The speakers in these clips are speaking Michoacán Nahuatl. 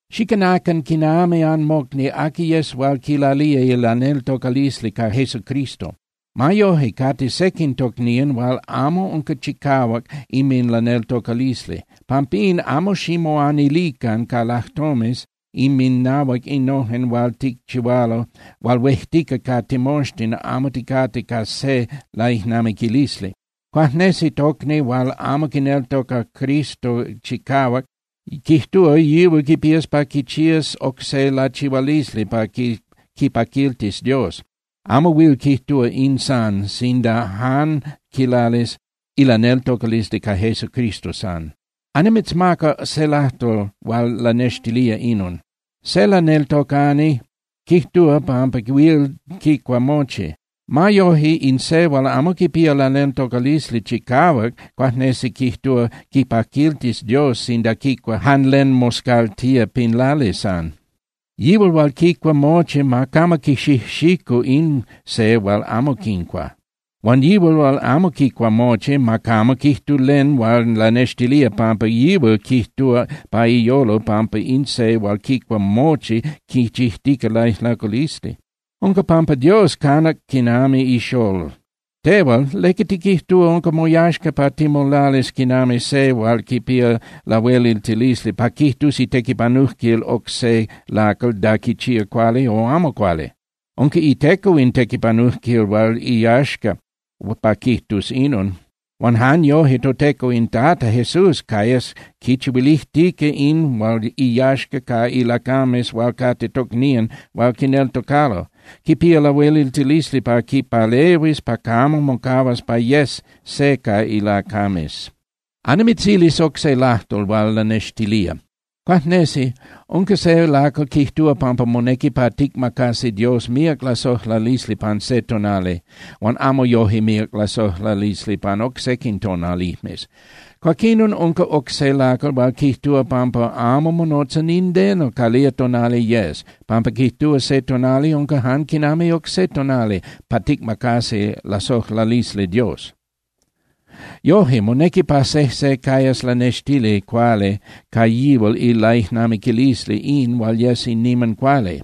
Xicanacan quinami anmocni aqui yes hual quilalía ilaneltocalisli ca Jesucristo. Ma yoje, cate sequin tocnían hual amo unca chicahuac inminlaneltocalisli. Pampín, amo ximoanilican ca lajtomes inminahuac innojen hual ticchihualo hual huejtica ca timoxtin amo ticate ca se laijnamiquilisli. Cuajnesi tocni hual amo quineltoca Cristo chicahuac quijtúa yihual quipías pa quichías oc se lachihualisli pa quipaquiltis Dios, amo huil quijtúa “in san” sinda jan quilalis ilaneltocalisli ca Jesucristo san. Annimitzmaca se lajtol hual lanextilía inon. Se laneltocani quijtúa pampa huil quicua mochi. Ma yoje, in se hual amo quipía ilaneltocalisli chicahuac cuajnesi quijtúa quipaquiltis Dios sinda quicua jan len moscaltía pin lali san. Yihual hual quicua mochi ma camo quixijxicu in se hual amo quincua. Huan yihual hual amo quicua mochi, ma camo quijtu len hual lanextilía pampa yihual quijtúa pa iyolo pampa in se hual quicua mochi quichijtica laijlaculisli. Unca pampa Dios canac quinami ixolol. Tehual, ¿leca tiquijtúa unca moyaxca pa timolalis quinami se hual quipía lahueliltilisli pa quijtus itequipanujquil oc se lacal da quichía cuali o amo cuali? Unca iteco in tequipanujquil hual iyaxca pa quijtus inon. Huan jan yoje toTeco in Tata Jesús cayas quinchihuilijtica in hual iyaxca ca ilacames hual cate tocnían hual quineltocalo, quipía lahueliltilisli pa quipalehuis pa camo mocahuas pa yes se ca ilacames. Annimitzilis oc se lajtol hual lanextilía. Cuajnesi unca se lacal quijtúa pampa monequi pa ticmacasi Dios míac lasojlalisli pan se tonali, huan amo yoje míac lasojlalisli pan oc sequin tonalijmes. Cuaquinon unca oc se lacal hual quijtúa pampa amo monotza nindeno calía tonali yes, pampa quijtúa se tonali unca jan quinami oc se tonali pa ticmacasi lasojlalisli Dios. Yoje, monequi pa sejse cayas lanextili cuali ca yihual ilaijnamiquilisli in hual yes in niman cuali.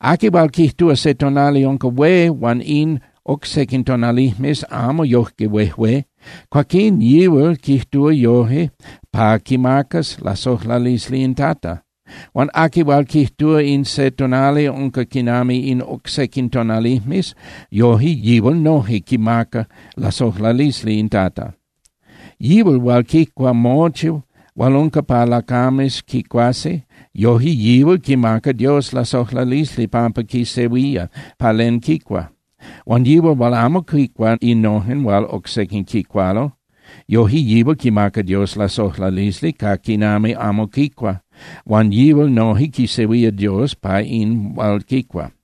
Aqui hual quijtúa se tonali unca hué huan in oc sequin tonalijmes amo yoje huejué, cuaquín yihual quijtúa yoje pa quimacas lasojlalisli in Tata. Huan aqui hual quijtúa in se tonali unca quinami in oc sequin tonalijmes, yoje yihual noje quimaca lasojlalisli in Tata. Yihual hual quicua mochi hual unca pa lacames quicuasi, yoje yihual quimaca Dios lasojlalisli pampa quisehuía pa len quicua. Huan yihual hual amo quicua innojen hual oc sequin quicualo, yoje yihual quimaca Dios lasojlalisli ca quinami amo quicua, huan yihual noje quisehuía Dios pa in hual quicua.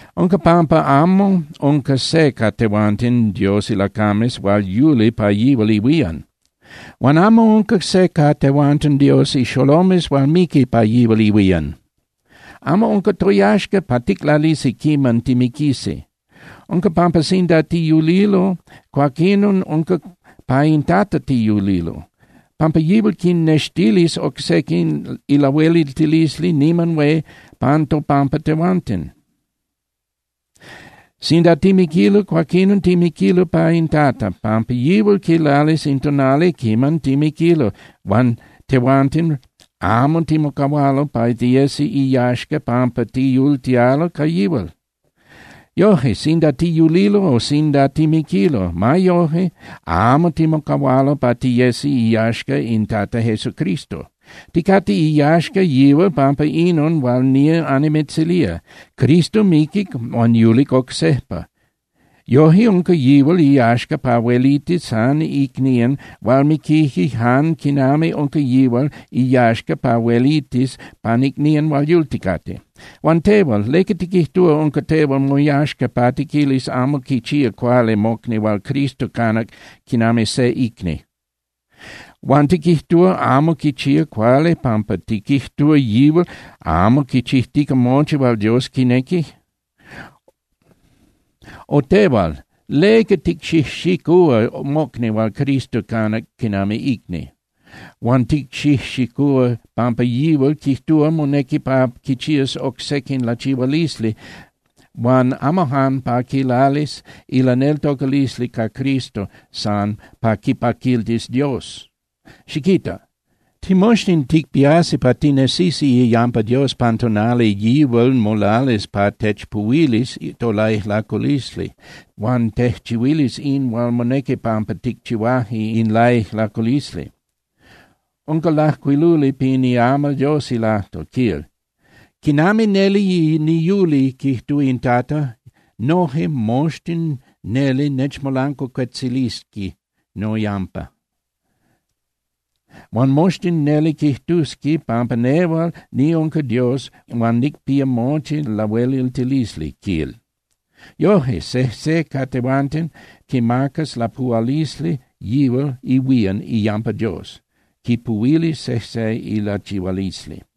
Unca pampa amo unca se ca tehuanten Dios ilacames hual yuli pa yihual ihuían. Huan amo unca se ca tehuanten Dios ixolomes hual miqui pa yihual ihuían. Amo unca toyaxca pa ticlalisi quiman timiquisi. Unca pampa sinda tiyulilo, cuaquinon unca pa in Tata tiyulilo, pampa yihual quinnextilis oc sequin ilahueliltilisli niman hué pan topampa tehuanten. Sinda timiquilo, cuaquinon timiquilo pa in Tata, pampa yihual quilalis in tonali quiman timiquilo huan tehuanten amo timocahualo pa tiyesi iyaxca pampa tiyultialo ca yihual. Yoje, sinda tiyulilo o sinda timiquilo, ma yoje amo timocahualo pa tiyesi iyaxca in Tata Jesucristo. Ticate iyaxca yihual pampa inon hual nía annimitzilía: Cristo miquic huan yulic oc sejpa. Yoje unca yihual iyaxca pa huelitis pan icnían hual miquije jan quinami unca yihual iyaxca pa huelitis pan icnían hual yulticate. Huan tehual, ¿leca tiquijtúa unca tehual moyaxca pa tiquilis amo quichía cuali mocni hual Cristo canac quinami se icni? ¿Huan tiquijtúa amo quichía cuali pampa tiquijtúa yihual amo quichijtica mochi hual Dios quinequi? O tehual, ¿leca ticxijxicúa mocni hual Cristo canac quinami icni, huan ticxijxicúa pampa yihual quijtúa monequi pa quichías oc sequin lachihualisli huan amo jan pa quilalis ilaneltocalisli ca Cristo san pa quipaquiltis Dios? Xiquita. Timoxtin ticpiasi pa tinesisi iyampa Dios pan tonali yihual molalis pa techpuhuilis tolaijlaculisli huan tejchihuilis in hual monequi pampa ticchihuaje in laijlaculisli. Unca lajcuiluli pin iamal Dios ilajtol, quil: Quinami neli niyuli, quijtúa in Tata, noje moxtin neli nechmolancuacuetzilisqui noyampa, huan moxtin neli quijtusqui pampa nehual niunca Dios huan nicpía mochi lahueliltilisli, quil. Yoje, sejse ca tehuanten quimacas lapuhualisli yihual ihuían iyampa Dios, quipuhuilis sejse ilachihualisli.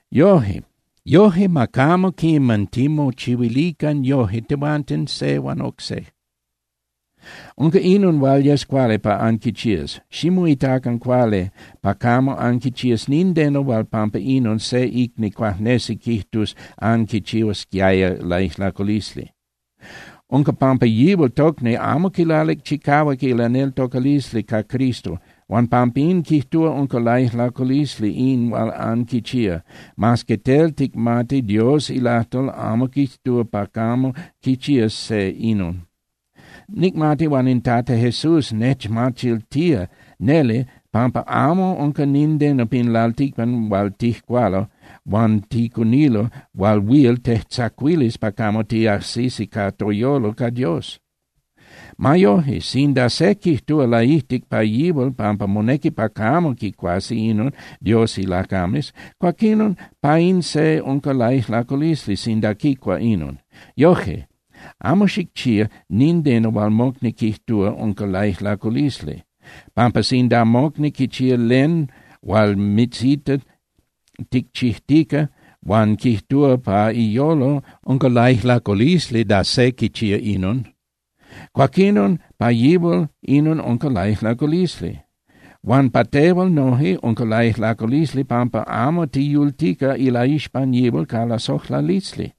Yoje, ma camo quiman timochihuilican yoje tehuanten se huan oc se. Unca inon hual yes cuali pa anquichías: Ximoitacan cuali pa camo anquichías nindeno hual pampa inon se tocni cuajnesi quijtus anquichihuasquiaya laijlaculisli. Unca pampa yihual tocni amo quilalic chicahuac ilaneltocalisli ca Cristo huan pampín quijtúa unca laijlaculisli in hual anquichía, mas que tel ticmati Dios ilajtol amo quijtúa pa camo quichías se inon. Nicmati huan in Tata Jesús nechmachiltía neli pampa amo unca nindeno pin lalticpan hual tijcualo huan ticunilo hual huil tejtzacuilis pa camo tiajsisi ca toyolo ca Dios. Ma yoje, sinda se quijtúa laijtic pa yihual pampa monequi pa camo quicuasi inon Dios ilacames, cuaquinon pa in se unca laijlaculisli sinda quicua inon. Yoje, amo xicchía nindeno hual mocni quijtúa unca laijlaculisli, pampa sinda mocni quichía len hual mitzita ticchijtica huan quijtúa pa iyolo unca laijlaculisli da se quichía inon, cuaquinon pa yihual inon unca laijlaculisli. Huan pa tehual noje unca laijlaculisli pampa amo tiyultica ilaixpan yihual ca lasojlalisli.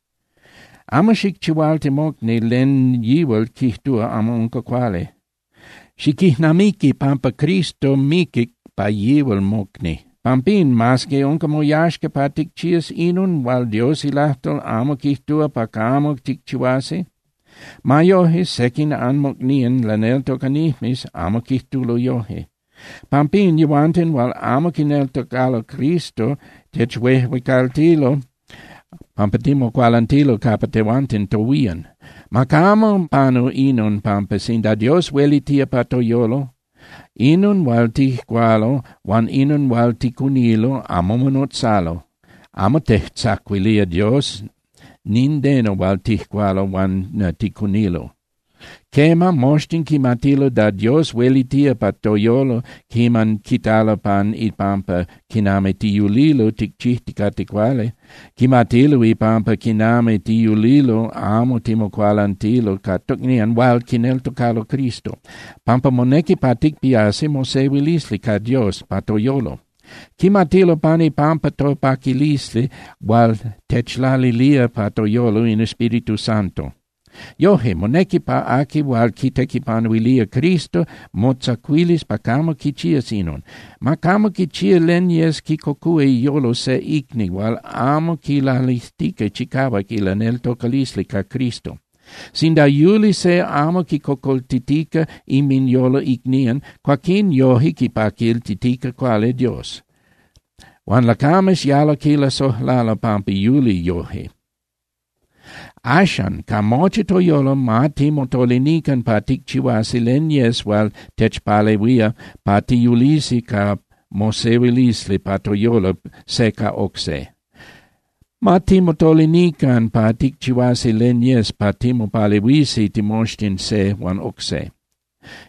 Amo xicchihualti mocni len yihual quijtúa amo unca cuali. Xiquijnamiqui pampa Cristo miquic pa yihual mocni. Pampín, mas que unca moyaxca pa ticchías inon hual Dios ilajtol amo quijtúa pa camo ticchihuasi, ma yoje sequin anmocnían laneltocanijmes amo quijtulo yoje. Pampín yehuanten hual amo quineltocalo Cristo techuejuecaltilo pampa timocualantilo capa tehuanten tohuían. Ma camo panu inon pampa sinda Dios huelitía pa toyolo, inon hual tijcualo huan inon hual ticunilo amo monotzalo, amo tejtzacuilía Dios nindeno hual tijcualo huan ticunilo. Quema, moxtin quimatilo da Dios huelitía pa toyolo quiman quitalo pan ipampa quinami tiyulilo ticchijticate cuali. Quimatilo ipampa quinami tiyulilo amo timocualantilo ca tocnían hual quineltocalo Cristo, pampa monequi pa ticpiasi mosehuilisli ca Dios pa toyolo. Quimatilo pan ipampa topaquilisli hual techlalilía pa toyolo in Espíritu Santo. Yoje, monequi pa aqui hual quitequipanuilía Cristo motzacuilis pa camo quichías inon: Ma camo quichía len yes quicocúa iyolo se icni hual amo quilalijtica chicahuac ilaneltocalisli ca Cristo. Sinda yuli se amo quicocoltitica inminyolo icnían, cuaquín yoje quipaquiltitica cuali Dios. Huan lacames yalo quilasojlalo pampa yuli yoje. Axan, ca mochi toyolo ma timotolinican pa ticchihuasi len yes hual techpalehuía pa tiyulisi ca mosehuilisli pa toyolo se ca oc se. Ma timotolinican pa ticchihuasi len yes pa timopalehuisi timoxtin se huan oc se.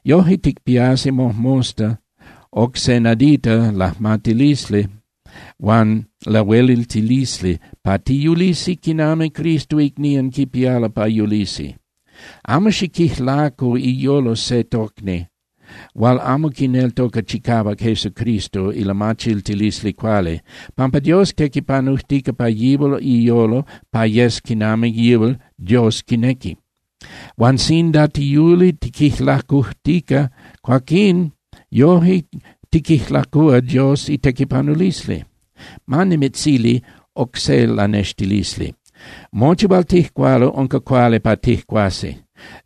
Yoje ticpiasi mojmosta oc se nadita lajmatilisli huan lahueliltilisli pa tiyulisi quinami Cristo icnían quipialo pa yulisi. Amo xiquijlacu iyolo se tocni hual amo quineltoca chicahuac Jesucristo ilamachiltilisli cuali, pampa Dios tequipanujtica pa yihual iyolo pa yes quinami yihual Dios quinequi. Huan sinda tiyuli tiquijlacujtica, cuaquín yoje tiquijlacúa Dios itequipanulisli. Ma nimitzili oc se lanextilisli. Mochi hual tijcualo unca cuali pa tijcuasi.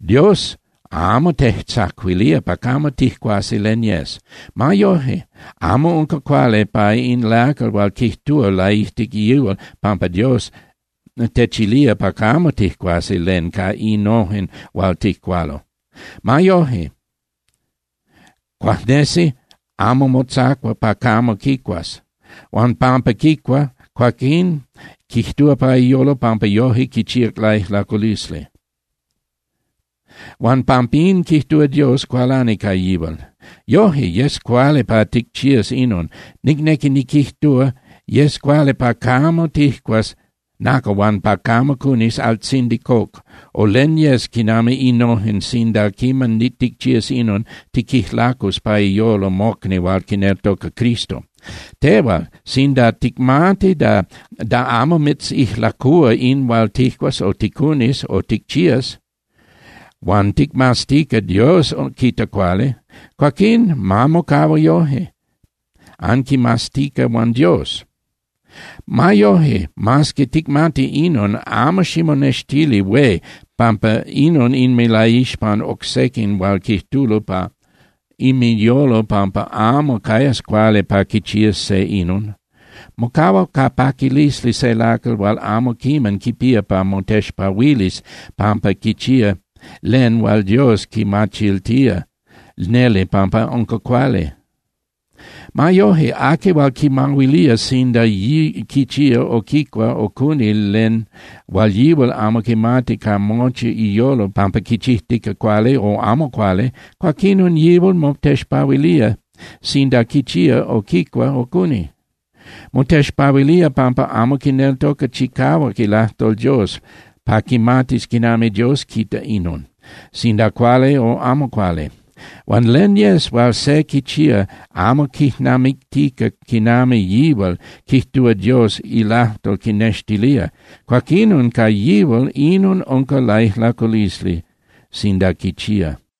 Dios amo tejtzacuilía pa camo tijcuasi len yes. Ma yoje, amo unca cuali pa in lacal hual quijtúa laijtic yihual pampa Dios techilía pa camo tijcuasi len ca innojen hual tijcualo. Ma yoje, cuajnesi amo motzacua pa camo quicuas. Huan pampa quicua, cuaquín quijtúa pa iyolo pampa yoje quichíac laijlaculisli, huan pampín quijtúa Dios cualani ca yihual. Yoje, yes cuali pa ticchías inon, nicnequi niquijtúa, yes cuali pa camo tijcuas nacal huan pa camo cunis altzindi coc, o len yes quinami innojen sinda quiman ticchías inon, tiquijlacus pa iyolo mocni hual quineltoca Cristo. Tehual, sinda ticmati da amo mitzijlacúa in hual tijcuas o ticunis o ticchías, huan ticmaztica Dios quita cuali, cuaquín ma mocahua yoje, anquimaztica huan Dios. Ma yoje, mas que ticmati inon, amo ximonextili hué pampa inon inminlaixpan oc sequin hual quijtulo pa inminyolo pampa amo cayas cuali pa quichías se inon. ¡Mocahua ca paquilisli se lacal hual amo quiman quipía pa motexpahuilis pampa quichía len hual Dios quimachiltía neli pampa unca cuali! Ma yoje, aqui hual quimahuilía sinda quichía o quicua o cuni len huan yihual amo quimati ca mochi iyolo pampa quichijtica cuali o amo cuali, cuaquinon yihual motexpahuilía sinda quichía o quicua o cuni. Motexpahuilía pampa amo quineltoca chicahuac ilajtol Dios pa quimatis quinami Dios quita inon, sinda cuali o amo cuali. Huan len yes hual se quichía amo quijnamictica quinami yihual quijtúa Dios ilajtol quinextilía, cuaquinon ca yihual inon unca laijlaculisli sinda quichía.